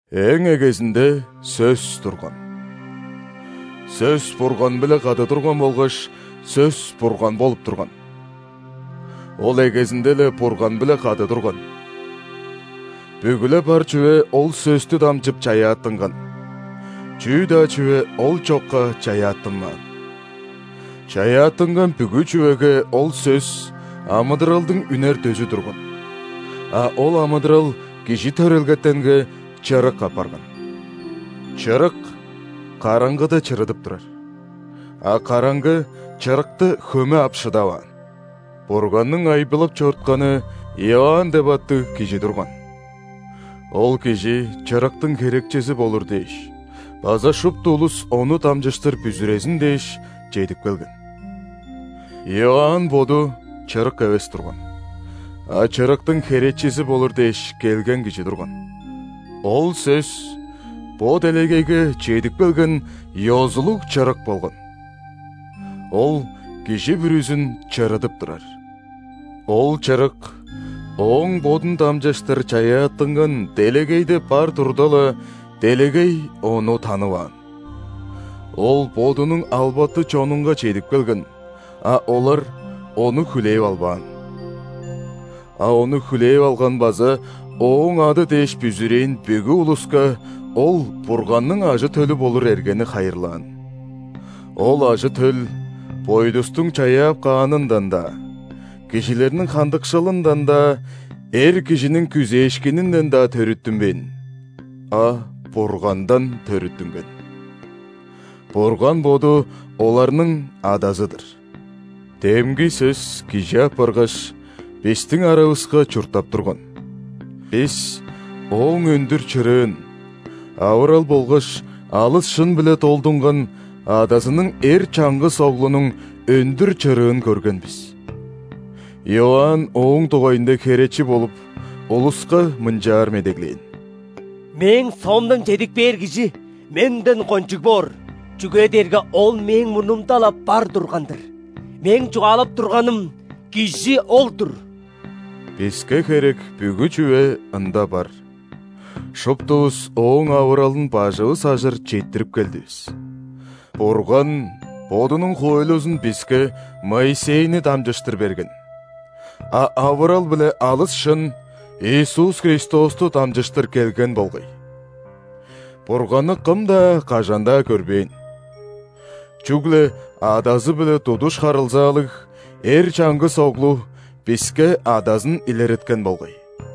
Эң эгезинде Сөс турган. Сөс Бурган-биле кады турган болгаш Сөс Бурган болуп турган. Ол эгезинде-ле Бурган-биле кады турган. Бүгү-ле бар чүве ол Сөстү дамчып чаяаттынган, чүү-даа чүве Ол чокка чаяаттынмаан. Чаяаттынган бүгү чүвеге ол Сөс амыдыралдың үнер дөзү турган, а ол амыдырал кижи төрелгетенге чырык апарган. Чырык караңгыда чырыдып турар, а караңгы Чырыкты хөме ап шыдаваан. Бурганның айбылап чорутканы Иоанн деп аттыг кижи турган. Ол кижи Чырыктың херечизи болур дээш база шупту улус ону дамчыштыр бүзүрезин дээш чедип келген. Иоанн боду – Чырык эвес турган, а Чырыктың херечизи болур дээш келген кижи турган. Ол Сөс – бо делегейге чедип келген ёзулуг Чырык болган. Ол кижи бүрүзүн чырыдып турар. Ол Чырык Ооң Бодун дамчыштыр чаяаттынган делегейде бар турда-ла, делегей Ону танываан. Ол Бодунуң албаты чонунга чедип келген, а олар Ону хүлээп албаан. А Ону хүлээп алган база Ооң ады дээш бүзүрээн бүгү улуска Ол Бурганның ажы-төлү болур эргени хайырлаан. Ол ажы-төл бойдустуң чаяап каанындан-даа, кижилерниң хандыкшылындан-даа, эр кижиниң күзээшкининден-даа төрүттүнмээн, а Бургандан төрүттүнген. Бурган Боду оларның Адазы-дыр. Демги Сөс Кижи апаргаш, бистиң аравыска чурттап турган. Бис Ооң өндүр чырыын – авырал болгаш алыс шын-биле долдунган Адазының эр чаңгыс Оглунуң өндүр чырыын көрген бис. Иоанн Ооң дугайында херечи болуп, улуска мынчаар медеглээн: «Мээң соомдан чедип кээр Кижи менден кончуг боор, чүге дээрге Ол мээң мурнумда-ла бар турган-дыр. Мээң чугаалап турганым Кижи ол-дур». Биске херек бүгү чүве Ында бар, шуптувус Ооң авыралын бажывыс ажыр четтирип келдивис. Бурган Бодунуң хоойлузун биске Моисейни дамчыштыр берген, а авырал биле алыс шын Иисус Христосту дамчыштыр келген болгай. Бурганны кым-даа, кажан-даа көрбээн. Чүгле Адазы-биле тудуш харылзаалыг эр чаңгыс Оглу биске Адазын илереткен болгай.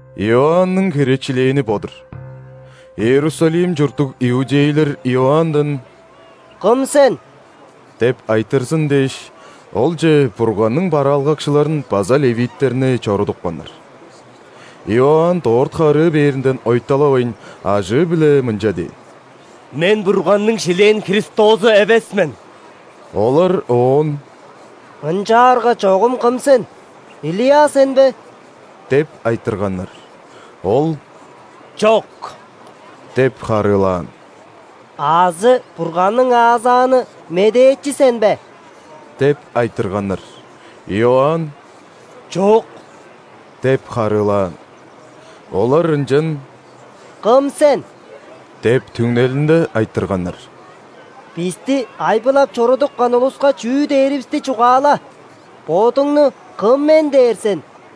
Иоанның херечилээни бо-дур. Иерусалим чурттуг иудейлер Иоанндан: «Кым сен?» – деп айтырзын дээш, олче Бурганның бараалгакчыларын база ·левиттерни чорудупканнар. Иоанн дорт харыы бээринден ойталавайн, ажыы-биле мынча дээн: «Мен Бурганның шилээн Христозу эвес мен». Олар оон: «Ынчаарга чогум кым сен? Илия сен бе?» – деп айтырганнар. Ол: «Чок» – деп харыылаан. «Азы Бурганның аазааны медээчи сен бе?» – деп айтырганнар. Иоанн: «Чок» – деп харыылаан. Олар ынчан: «Кым сен? – деп түңнелинде айтырганнар. – Бисти айбылап чорудупкан улуска чүү дээривисти чугаала. Бодуңну кым мен дээр сен?»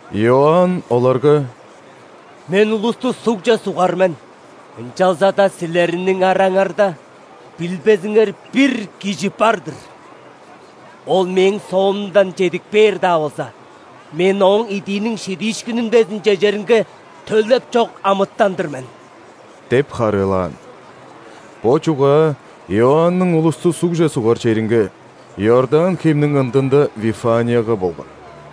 Иоанн оларга: «Мен улусту сугже сугар мен, ынчалза-даа силерниң араңарда билбезиңер бир Кижи бар-дыр, Ол мээң соомдан чедип кээр-даа болза, мен Ооң идииниң шидиишкинин безин чежеринге төлеп чок амытан-дыр мен» – деп харыылаан. Бо чугаа Иоанның улусту сугже сугар черинге – Иордан хемниң ындында Вифанияга болган.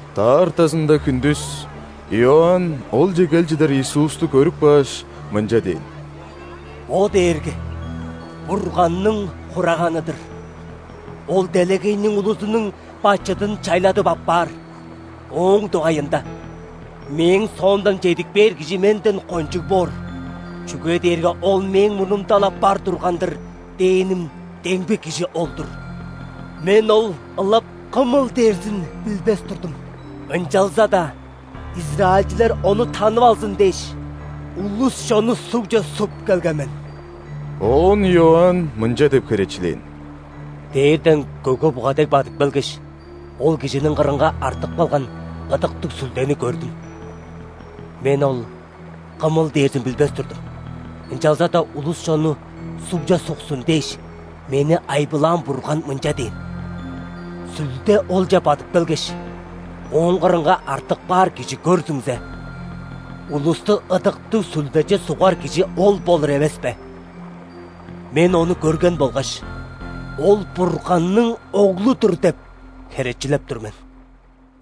Даартазында хүндүс Иоанн олче кел чыдар Иисусту көрүп кааш, мынча дээн: «Бо дээрге Бурганның Хураганы-дыр! Ол делегейниң улузунуң бачыдын чайладып аппаар. Ооң дугайында: „Мээң соомдан чедип кээр Кижи менден кончуг боор, чүге дээрге Ол мээң мурнумда-ла бар турган-дыр“ – дээним демги Кижи ол-дур. Мен Ол ылап кымыл дээрзин билбес турдум, ынчалза-даа израильчилер Ону танып алзын дээш, улус-чонну сугже суп келген мен». Оон Иоанн мынча деп херечилээн: «Дээрден көге-буга дег бадып келгеш, ол Кижиниң кырынга артып калган Ыдыктыг Сүлдени көрдүм. Мен Ол кымыл дээрзин билбес турдум, ынчалза-даа улус-чонну сугже суксун дээш, мени айбылаан Бурган мынча дээн: „Сүлде Олче бадып келгеш, Ооң кырынга артып каар кижи көрзүңзе, улусту Ыдыктыг Сүлдеже сугар Кижи ол болур эвеспе“. Мен ону көрген болгаш, „Ол – Бурганның Оглу-дур“ деп херечилеп тур мен».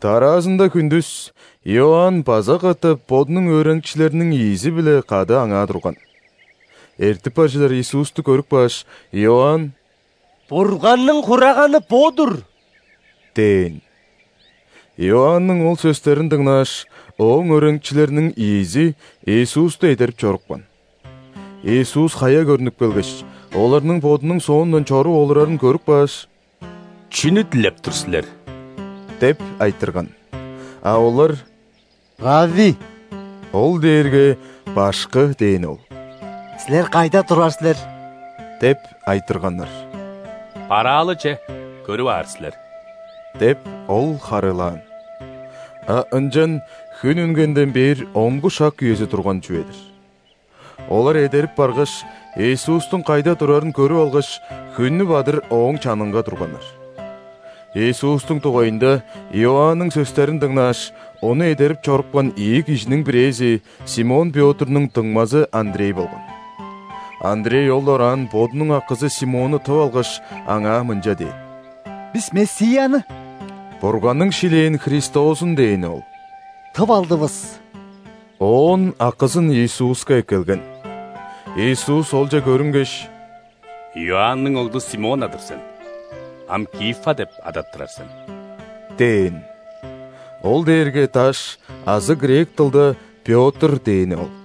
Дараазында хүндүс Иоанн база катап бодунуң өөреникчилериниң ийизи-биле кады аңаа турган. Эртип бар чыдар Иисусту көрүп кааш, Иоанн: «Бурганның Хураганы бо-дур!» – дээн. Иоанның ол сөстерин дыңнааш, ооң өөреникчилериниң ийизи Иисусту эдерип чорупкан. Иисус хая көрнүп келгеш, оларның Бодунуң соондан чоруп олурарын көрүп кааш: «Чүнү дилеп тур силер?» – деп айтырган. А олар: «Равви (ол дээрге „Башкы“ дээни ол), Силер кайда турар силер?» – деп айтырганнар. «Бараалы че, көрүп аар силер» – деп, Ол харыылаан. А ынчан хүн үнгенден бээр онгу шак үези турган чүве-дир. Олар эдерип баргаш, Иисустуң кайда турарын көрүп алгаш, хүннү бадыр Ооң чанынга турганнар. Иисустуң дугайында Иоанның сөстерин дыңнааш, Ону эдерип чорупкан ийи кижиниң бирээзи Симон Пётрнуң дуңмазы Андрей болган. Андрей ол дораан бодунуң акызы Симонну тып алгаш, аңаа мынча дээн: «Бис Мессияны (Бурганның шилээн Христозун дээни ол) тып алдывыс». Оон акызын Иисуска эккелген. Иисус олче көрүнгеш: «Иоанның оглу Симон-на-дыр сен. Ам Кифа деп адаттырар сен» – дээн. (Ол дээрге «Даш» азы грек дылда «Пётр» дээни ол.)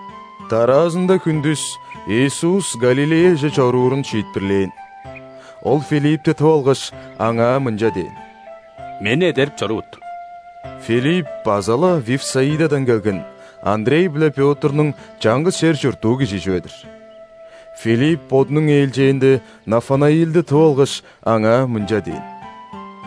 Дараазында хүндүс Иисус Галилеяже чоруурун шиитпирлээн. Ол Филиппти тып алгаш, аңаа мынча дээн: «Мени эдерип чорувут». Филипп база-ла Вифсаидадан келген, Андрей биле Пётрнуң чаңгыс чер чурттуу кижи чүве-дир. Филипп, бодунуң ээлчээнде, Нафанаилди тып алгаш, аңаа мынча дээн: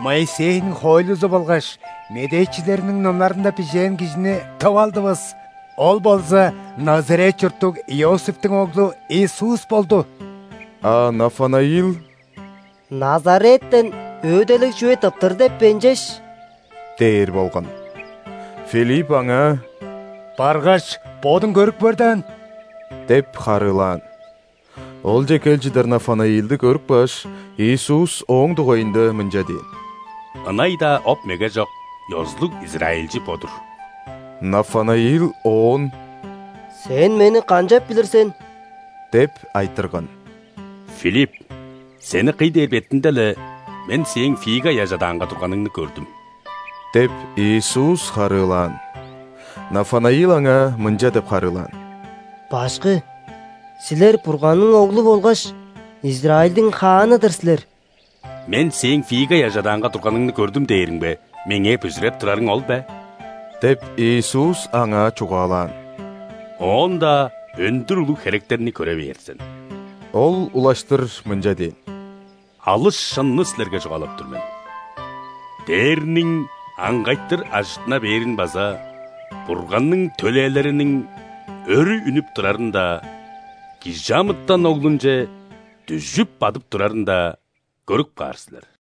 «Моисейниң хоойлузу болгаш медээчилерниң номнарында бижээн Кижини тып алдывыс. Ол болза Назарет чурттуг Иосифтиң оглу Иисус болду». А Нафанаил: «Назареттен өөделиг чүве тыптыр деп бе ынчаш?» – дээр болган. Филипп аңаа: «Баргаш, бодуң көрүп көр даан» – деп харыылаан. Олче кел чыдар Нафанаилди көрүп кааш, Иисус ооң дугайында мынча дээн: «Ынай-даа оп-меге чок, ёзулуг израильчи бо-дур». Нафанаил Оон: «Сен мени канчап билир сен?» – деп айтырган. «Филипп сени кый дээр бетинде-ле, Мен сээң фига ыяжы адаанга турганыңны көрдүм» – деп, Иисус харыылаан. Нафанаил Аңаа мынча деп харыылаан: «Башкы! Силер – Бурганның Оглу болгаш Израильдиң хааны-дыр силер!» «„Мен сээң фига ыяжы адаанга турганыңны көрдүм“ дээримге, Меңээ бүзүреп турарың ол бе? – деп, Иисус аңаа чугаалаан. – Оон-даа өндүр улуг херектерни көре бээр сен». Ол улаштыр мынча дээн: «Алыс шынны силерге чугаалап тур мен: дээрниң аңгайтыр ажыттына бээрин база Бурганның төлээлериниң өрү үнүп турарын-даа, ·Кижи амытан Оглунче дүжүп бадып турарын-даа көрүп каар силер».